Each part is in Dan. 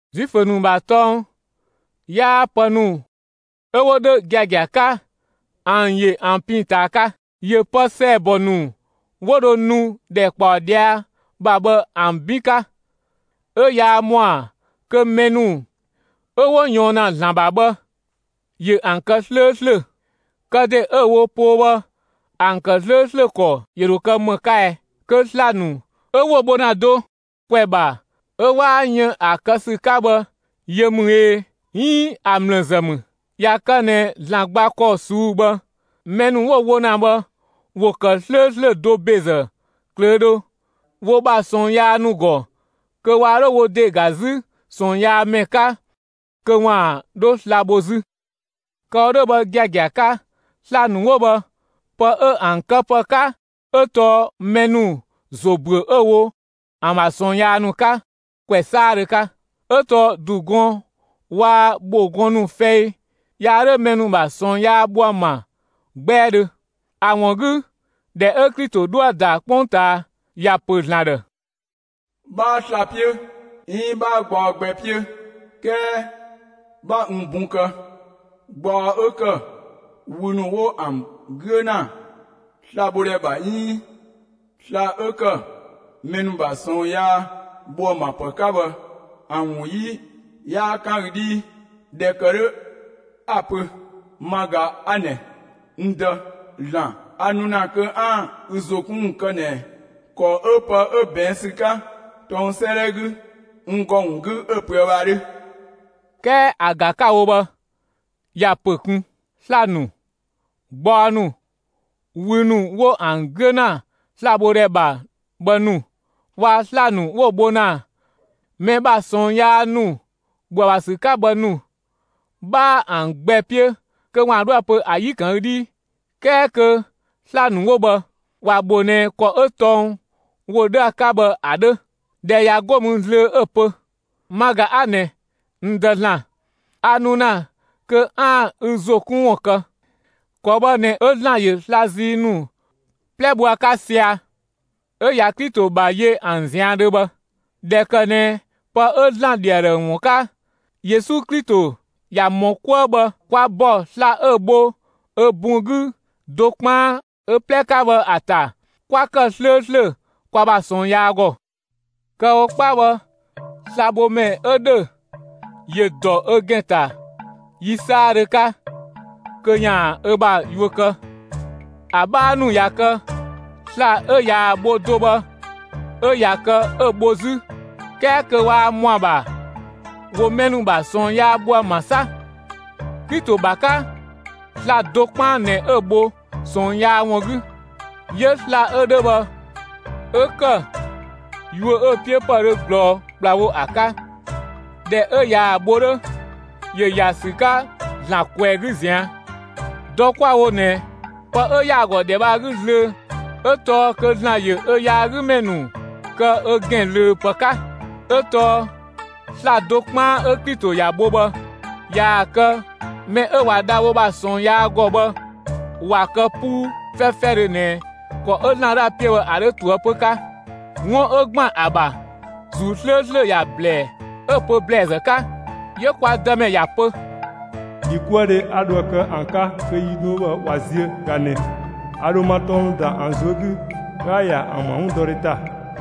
Zuifö ‑nu ‑bha tɔng 'yaa pë ‑nu 'ö 'wo 'dhö giagia 'ka ‑an ‑yö ‑an pin ꞊taa 'ka, ‑yö pë ‑sɛɛbɔ ‑nu 'wo dho nu ‑dhɛkpaɔ ꞊dhia' ‑bha bhë ‑an 'bin 'ka; 'ö yaa ‑mɔa kö mɛ ‑nu 'ö 'wo ꞊yɔɔn ‑na ‑Zlan ‑bha bhë, ‑yö ‑an kë 'slööslö. Kë ‑de 'ö‑ wo poo bhë ‑an ‑kë 'slööslö ‑kɔ ‑yö ‑dho kë 'më 'ka ɛɛ? Kö sla‑ ‑nu 'ö 'wo‑ bho ‑na do ‑kwɛ ‑bha 'ö 'waa yën ‑a kë ‑sü 'ka bhë yö ‑mü ꞊ee, 'iin ‑a ‑mlë ‑zë ‑mü? ꞊Ya kë ꞊nɛ ‑Zlan gba ‑kɔ ꞊suu'‑ bhë, mɛ ‑nu 'wo‑ wo ‑na bhë, ‑wo ‑kë 'slööslö do ‑bezë ꞊klöödhö, wo ‑bha ꞊sɔɔn yaa ‑nu ‑gɔ, kö waa 'dho wo ‑de ‑ga 'zü ꞊sɔɔnyaamɛ 'ka kö ‑waan 'dhö sla‑ bho 'zü. Kë‑ wo 'dhö bhë giagia 'ka, sla‑ ‑nu 'wo bhë, pë 'ö ‑an këpë 'ka 'ö tɔɔ mɛ ‑nu ‑zo ‑büö 'ö‑ wo ‑an ‑bha ꞊sɔɔn yaa ‑nu 'ka ‑kwɛ 'saadhö 'ka, 'ö tɔɔ ‑du gɔn waa‑ ‑bho gɔn ‑nu fɛi yaa 'dhö mɛ ‑nu ‑bha ꞊sɔɔn yaa bho ‑an ‑bha 'gbɛɛdhö. ‑A ‑wun 'gü, ‑dhɛ 'ö Klito 'dhoë‑ ‑da 'kpongtaa, ‑ya ‑pö ‑Zlan ‑dhë: 'Bhaa sla‑ 'piö 'iin 'bhaa gbaɔ gbɛ 'piö; 'kɛɛ 'bha n bun kë. Gbaɔ 'ö ‑kë wü ‑nu 'wo ‑an 'güö ‑na slabhodhɛ ‑bha 'iin sla‑ 'ö ‑kë mɛ ‑nu ‑bha ꞊sɔɔn yaa ‑bho ‑an ‑bha ‑pë 'ka bhë, ‑an ‑wun 'yi 'yaa 'kan ü 'dhii. ꞊Dhɛ ‑kë 'dhö 'a‑ pö: Ma ꞊ga 'a ꞊nɛ, (n Dë) ‑Zlan; a nu ‑na kö 'aan‑ ü ‑zo 'kun ‑wun kë ꞊nɛ ‑kɔ 'ö pë 'ö ꞊bɛɛn' ‑sü 'ka tɔng 'sëëdhɛ 'gü n ‑gɔ ‑wun 'gü 'ö‑ pöë bhë ‑a 'dhö. 'Kɛɛ ‑a ‑ga 'ka‑ wo bhë, ‑ya ‑pö ꞊kun: Sla‑ nu, gbaɔ ‑nu, wü ‑nu 'wo ‑an 'güö ‑na slabhodhɛ ‑bha bhë ‑nu, waa‑ sla‑ ‑nu 'wo‑ bho ‑na mɛ ‑bha ꞊sɔɔn yaa ‑nu ‑bho ‑a ‑bha ‑sü 'ka bhë ‑nu, 'bhaa ‑an gbɛ 'piö kö ‑waan 'dhoë‑ pö ‑a 'yi‑ ‑kan ü 'dhii. 'Kɛɛ kö sla‑ ‑nu 'wo bhë, ‑wa ‑bho ꞊nɛ ‑kɔ 'ö tɔng ‑wo 'dhö ‑a 'ka bhë ‑a 'dhö. ꞊Dhɛ ꞊ya 'go mü zlöö 'ö‑ pö: Ma ꞊ga 'a ꞊nɛ, (n Dë) ‑Zlan, a nu ‑na kö 'aan‑ ü ‑zo 'kun ‑wun kë. ‑Kɔ bhë ꞊nɛ 'ö ‑Zlan ‑yö sla‑ zii nu 'plɛ bho ‑a 'ka sɛa‑, 'ö ꞊ya Klito ‑bha yö ‑an ꞊zian' dhö bhë. ꞊Dhɛ ‑kë ꞊nɛ pë 'ö ‑Zlan ‑dhi ‑a ‑dhë ‑wun 'ka, Yesu Klito ꞊yaa‑ ‑mɔ 'kuë bhë, kwa ‑bɔ sla‑ 'ö‑ bho ö bun 'gü do 'kpaan ö 'plɛ 'ka bhë ‑a ‑ta 'kwa kë 'slööslö kwa ‑bha ꞊sɔɔn yaa ‑gɔ. Kë‑ wo 'kpa bhë, slabhomɛ 'ö ‑dhö, ‑yö ‑dɔ ö ‑gɛn ‑ta yi 'saadhö 'ka kö ‑yaan ö ‑bha yuö kë; ‑a 'bhaa ‑nu ꞊ya kë, sla‑ 'ö ꞊yaa‑ bho do bhë 'ö ꞊ya kë 'ö‑ bho 'zü; 'kɛɛ kö waa ‑mɔ ‑a ‑bha ‑wo mɛ ‑nu ‑bha ꞊sɔɔn yaa bho ‑an ‑bha 'sa. Klito ‑bha 'ka, sla‑ do 'kpaan ꞊nɛ 'ö‑ bho ꞊sɔɔn yaa ‑wun 'gü; 'yö‑ sla‑ 'ö 'dhö bhë, 'ö ‑kë yuö 'ö‑ 'piö ‑pë dhö ꞊glɔɔ ‑kplawo ‑a 'ka. ꞊Dhɛ 'ö ꞊yaa‑ bho 'dhö, ‑yö ‑ya ‑sü 'ka ‑Zlan ꞊kwɛɛ‑ 'gü ꞊zian'. Dɔ 'kwa‑ wo ꞊nɛ, pë 'ö ‑yaa ‑gɔ ‑dhɛ bhë ‑a 'gü zlöö 'ö tɔɔ kö ‑Zlan ‑yö ö yaagümɛ ‑nu kë ö ‑gɛn ꞊löö ‑pë 'ka. 'Ö tɔɔ sla‑ do 'kpaan 'ö Klito ‑ya bho bhë, ꞊yaa‑ kë mɛ 'ö ꞊wa dha wo ‑bha ꞊sɔɔn yaa ‑gɔ bhë ꞊wa kë 'puu 'fɛfɛdhö ꞊nɛ ‑kɔ 'ö ‑Zlan 'dhoë‑ 'piö bhë ‑a 'dhö ꞊toëpö 'ka. 'Wun 'ö ‑gban ‑a ‑bha, ‑Zuu 'slööslö ‑ya ‑blɛɛ 'ö‑ pö ‑blɛɛzë 'ka: 'Yö kwa Dëmɛ ya pö: ‑Dhikuëdhe 'a dhoë‑ kë ‑an 'ka kö yi ‑nu 'wo bhë ꞊wa ziö ꞊ga ꞊nɛ: A ‑dho ma tɔng ‑nu ‑da ‑an ꞊zuö' 'gü, 'ö 'a‑ ‑ya ‑an ‑bha 'wundɔdhe ‑ta.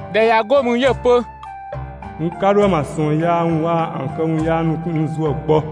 ꞊Dhɛ ꞊ya 'go mü, 'yö‑ pö: N 'ka 'dho ‑an ‑bha ꞊sɔɔn yaa ‑nu waa‑ ‑an këwun yaa ‑nu ‑wun kun n ‑zuë gbɔ.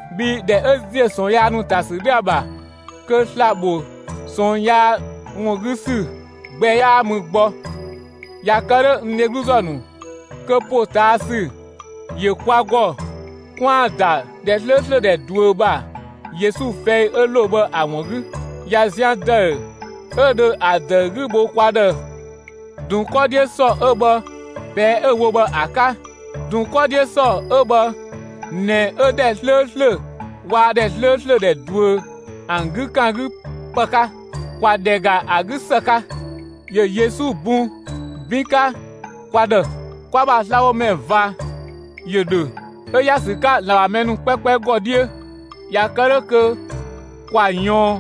Bhii ‑dhɛ 'ö ‑ziö ꞊sɔɔn yaa ‑nu ‑ta ‑sü 'dhö ‑a ‑bha, kö sla‑ ‑bho ꞊sɔɔn yaa ‑wun 'gü ‑sü gbɛ 'yaa mü gbɔ. ꞊Ya kë 'dhö, n dhegluzë ‑nu, kö ‑potaasü ‑yö kwa ‑gɔ 'kwaan‑ ‑da ‑dhɛ 'slööslö ‑dhɛ ꞊duö ‑bha Yesu fɛi 'ö ‑lo bhë ‑a ‑wun 'gü. ꞊Ya zian ‑dëü 'ö ‑dhö ‑a ‑dëü 'gü bho kwa ‑dhë ‑dun 'kɔ 'dhiö ‑sɔ 'ö bhë, ꞊pɛɛ'‑ 'ö‑ wo bhë ‑a 'ka; ‑dun 'kɔ 'dhiö ‑sɔ 'ö bhë ꞊nɛ 'ö ‑dhɛ 'slööslö waa‑ ‑dhɛ 'slööslö ‑dhɛ ꞊duö ‑an 'gü ‑kan 'gü ‑pë 'ka. ‑Kwa ‑dhɛ ‑ga ‑a 'gü ‑së 'ka, ‑yö Yesu bun 'bin 'ka kwa ‑dhë. Kwa ‑bha slabhomɛ ꞊va ‑yö ‑dhö 'ö ‑ya ‑sü 'ka ‑Zlan ‑bha mɛ ‑nu 'kpɛkpɛ ‑gɔ 'dhiö. ꞊Ya kë 'dhö kö ‑kwa ꞊yɔɔn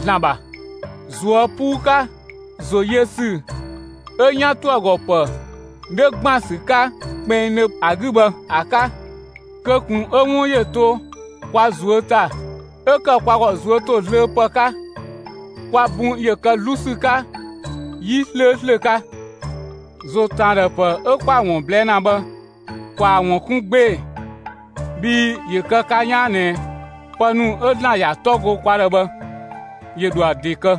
‑Zlan ‑bha, ꞊zuö' 'puu 'ka, ‑zo yö ‑sü 'ö‑ 'yan ‑toë ‑gɔ ‑pë 'dhö ‑gban ‑sü 'ka kpinngdhö ‑a 'gü bhë ‑a 'ka. Kö ꞊kun 'ö 'wun ‑yö to kwa ꞊zuö' ‑ta 'ö ‑kë kwa ‑gɔ ꞊zuö' ‑to zlöö ‑pë 'ka. Kwa bun ‑yö kë 'zlu ‑sü 'ka 'yi 'slööslö 'ka. ‑Zo ‑tën ‑a ‑dhë ‑pë 'ö 'kwa‑ ‑wun ꞊blɛɛ' ‑na bhë, ‑kwaa ‑wun 'kun 'gbee‑, bhii ‑yö kë ka 'yaan ꞊nɛ pë ‑nu 'ö ‑Zlan ‑ya 'tɔ go kwa ‑dhë bhë, ‑yö ‑dho ‑a ‑de kë.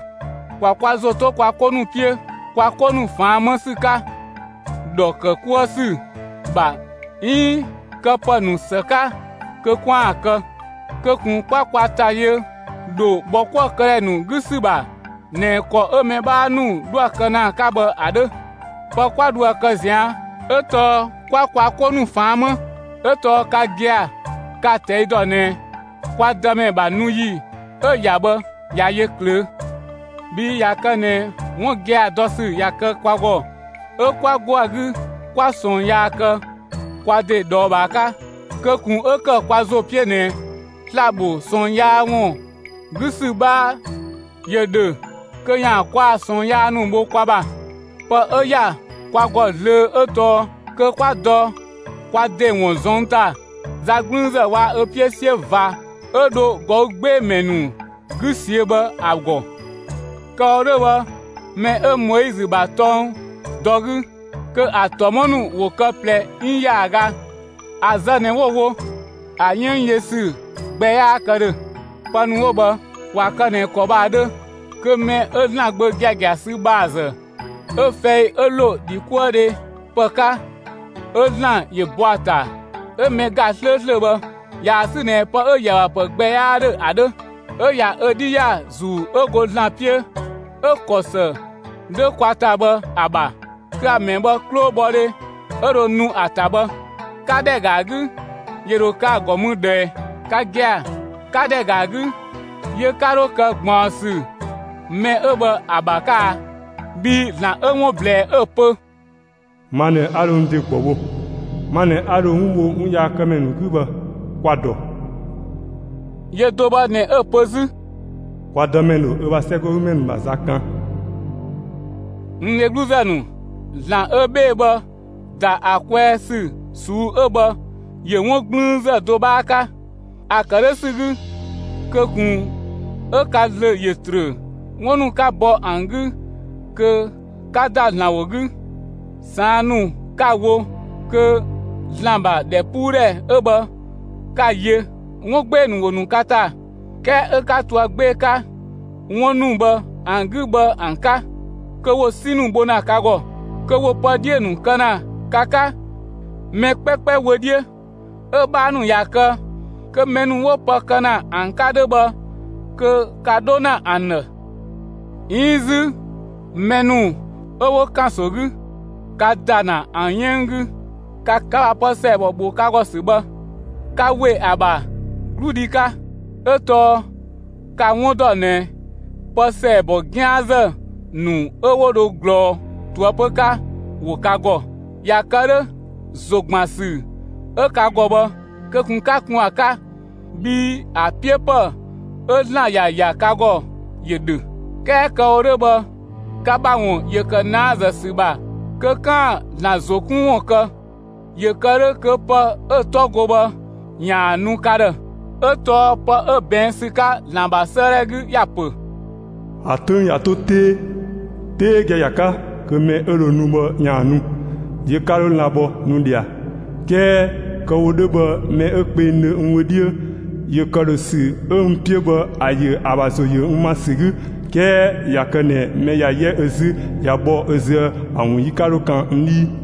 ‑Kwa kwa ‑zo 'to kwa 'ko ‑nu 'piö kwa 'ko ‑nu ꞊faan' 'më ‑sü 'ka ‑dhɔ ‑kë 'kuë ‑sü ‑bha 'iin kö pë 'ö këpë ‑nu ‑së 'ka kö 'kwaan‑ kë. Kö ꞊kun 'kwa kwa ‑ta yö ‑dho ‑bhɔkuëkëdhɛ ‑nu 'gü ‑sü ‑bha ꞊nɛ ‑kɔ 'ö mɛ 'bhaa ‑nu 'dhoë‑ kë ‑na 'ka bhë ‑a 'dhö. Pë 'kwa dhoë‑ kë ꞊zian' 'ö tɔɔ 'kwa kwa 'ko ‑nu ꞊faan' 'më 'ö tɔɔ ka gia‑ ka‑ ꞊tɛi' ‑dɔ ꞊nɛ kwa Dëmɛ ‑bha nu ‑yi 'ö‑ ‑ya bhë ꞊ya yö ꞊klöö'. Bhii ꞊ya kë ꞊nɛ 'wun giagia dɔ ‑sü ꞊ya kë kwa ‑gɔ 'ö 'kwa 'go ‑a 'gü 'kwa ꞊sɔɔn yaa kë kwa ‑de ꞊dhɔɔbhaa 'ka, kö ꞊kun 'ö ‑kë kwa ‑zo 'piö ꞊nɛ sla‑ ‑bho ꞊sɔɔn yaa ‑wun 'gü ‑sü 'bhaa ‑yö ‑dho kö ‑yaan kwa ‑bha ꞊sɔɔn yaa ‑nu bho kwa ‑bha. Pë 'ö ‑ya kwa ‑gɔ zlöö 'ö tɔɔ kö 'kwa dɔ kwa ‑de ‑wun ꞊zɔnng' ‑ta za 'gblüünzë waa‑ ö 'piö 'siö ꞊va 'ö dho ꞊gɔü' 'gbee‑ ‑mɛ ‑nu 'gü ꞊siö'‑ bhë ‑a ‑gɔ. Kë‑ wo 'dhö bhë, mɛ 'ö Moizö ‑bha tɔng dɔ 'gü, kö ‑a ‑tɔmɔ ‑nu ‑wo kë ꞊plɛ 'iin ‑yaaga, ‑a zë ꞊nɛ 'wo‑ wo; ‑a 'yënng yö ‑sü gbɛ 'yaa kë ‑dhö. Pë ‑nu 'wo bhë, ꞊wa kë ꞊nɛ ‑kɔ bhë ‑a 'dhö, kö mɛ 'ö ‑Zlan Gbö giagia sü ‑bha ‑zë, 'ö‑ fɛi 'ö ‑lo ‑dhikuëdhe ‑pë 'ka 'ö ‑Zlan ‑yö bɔ ‑a ‑ta 'ö mɛ ‑ga 'slööslö bhë, ꞊yaa‑ sü ꞊nɛ pë 'ö‑ ‑yö ‑a ‑bha ‑pë gbɛ 'yaa 'dhö ‑a 'dhö, 'ö ꞊ya ö 'dhi ‑ya ‑Zuu 'ö go ‑Zlan 'piö 'ö‑ ‑kɔ ‑së 'dhö kwa ‑ta bhë ‑a ‑bha, kö ‑a ‑mɛ bhë 'klobhɔdhe 'ö dho nu ‑a ‑ta bhë, 'ka ‑dhɛ ‑ga ‑a 'gü ‑yö ‑dho kë ‑a ‑gɔ mü ꞊dhë ꞊ɛɛ? Ka gia‑, 'ka ‑dhɛ ‑ga ‑a 'gü, yö 'ka 'dho kë ꞊gbaɔnsü mɛ 'ö bhë ‑a ‑bha 'ka a? Bhii ‑Zlan 'ö 'wun ꞊blɛɛ 'ö‑ pö: Ma ꞊nɛ 'a dho n ‑de ‑gbɔ bho, ma ꞊nɛ 'a dho 'wun bho 'wunyaakëmɛ ‑nu 'gü bhë, kwa‑ dɔ. Yö do bhë ꞊nɛ 'ö‑ pö 'zü: Kwa Dëmɛ ‑dho ö ‑bha 'sɛgɔgümɛ ‑nu ‑bha za kan. (N dhegluzë ‑nu,) ‑Zlan 'ö 'bhee‑ bhë, ‑da ‑a kwɛɛ ‑sü ꞊suu'‑ 'ö bhë ‑yö 'wun 'gblüünzë do 'bhaa 'ka. ‑A ‑kë 'dhö ‑sü 'gü, kö ꞊kun 'ö ka ‑zlö ‑yö ‑trö 'wun ‑nu 'ka bɔ ‑an 'gü kö 'ka ‑da ‑Zlan ‑wo 'gü, ꞊saan' ‑nu 'ka‑ wo kö ‑Zlan ‑bha ‑dhɛpuudhɛ 'ö bhë 'ka‑ yö, 'wun 'gbee‑ ‑nu ‑wo ‑nu ka ‑ta, 'kɛɛ 'ö 'ka to ‑a 'gbee‑ 'ka 'wun ‑nu bhë ‑an 'gü bhë ‑an 'ka; kö ‑wo 'si ‑nu bho ‑na ka ‑gɔ, kö ‑wo pë 'dhiö‑ ‑nu kë ‑na ka 'ka mɛ 'kpɛkpɛ wö 'dhiö; 'ö‑ 'bhaa ‑nu ꞊ya kë, kö mɛ ‑nu 'wo pë kë ‑na ‑an 'ka 'dhö bhë kö ka 'dho ‑na ‑an ‑dhë; 'iin 'zü mɛ ‑nu 'ö 'wo ‑kanso 'gü, ka ‑da ‑na ‑an 'yënng 'gü; ka ‑bha pë ‑sɛɛbɔ ‑bho ka ‑gɔ ‑sü bhë, ka ‑we ‑a ‑bha 'gludhi 'ka. 'Ö tɔɔ ka‑ 'wun ‑dɔ ꞊nɛ pë ‑sɛɛbɔ 'gian ‑zë ‑nu 'ö 'wo dho ꞊glɔɔ ꞊toëpö 'ka ‑wo ka ‑gɔ. ꞊Ya kë 'dhö, ‑zogbansü 'ö ka ‑gɔ bhë, kö ꞊kun 'ka kun ‑a 'ka; bhii ‑a 'piö ‑pë 'ö ‑Zlan ‑ya ‑ya ka ‑gɔ ‑yö ‑dhö. 'Kɛɛ kë‑ wo 'dhö bhë, ka ‑bha ‑wun ‑yö ‑kë ꞊naazë ‑sü ‑bha kö 'kaan‑ ‑Zlan ‑zo 'kun ‑wun kë ‑yö kë 'dhö kö pë 'ö‑ 'tɔ go bhë ‑yaan ‑a nu ka ‑dhë. 'Ö tɔɔ pë 'ö ꞊bɛɛn' ‑sü 'ka ‑Zlan ‑bha 'sëëdhɛ 'gü ‑ya ‑pö: ‑A 'töng ꞊ya 'to 'tee, 'tee giagia 'ka, kö mɛ 'ö dho nu bhë ‑yaan nu, yö 'ka 'dho lan‑ bhɔ nu ꞊dhia. 'Kɛɛ kö kë‑ wo 'dhö bhë mɛ 'ö kpengdhö n wö 'dhiö ‑yö ‑këdhösü 'ö n 'piö bhë ‑a yö ‑a ‑bha ‑zo ‑yö n ‑ma ‑sü 'gü, 'kɛɛ ꞊ya kë ꞊nɛ mɛ ꞊ya 'yɛ ö 'zü ꞊ya bhɔ ö züë ‑a ‑wun 'yi 'ka 'dho kan n 'dhii.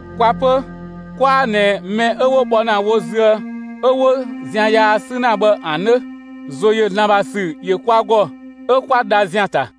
Kwa 'pö, 'kwaa ꞊nɛ mɛ 'ö 'wo bhɔ ‑na wo züë 'ö 'wo zian yaa 'sü ‑na bhë ‑an 'dhö. ‑Zo ‑yö ‑Zlan ‑bha ‑sü ‑yö kwa ‑gɔ; 'ö kwa dha ‑zian ‑ta.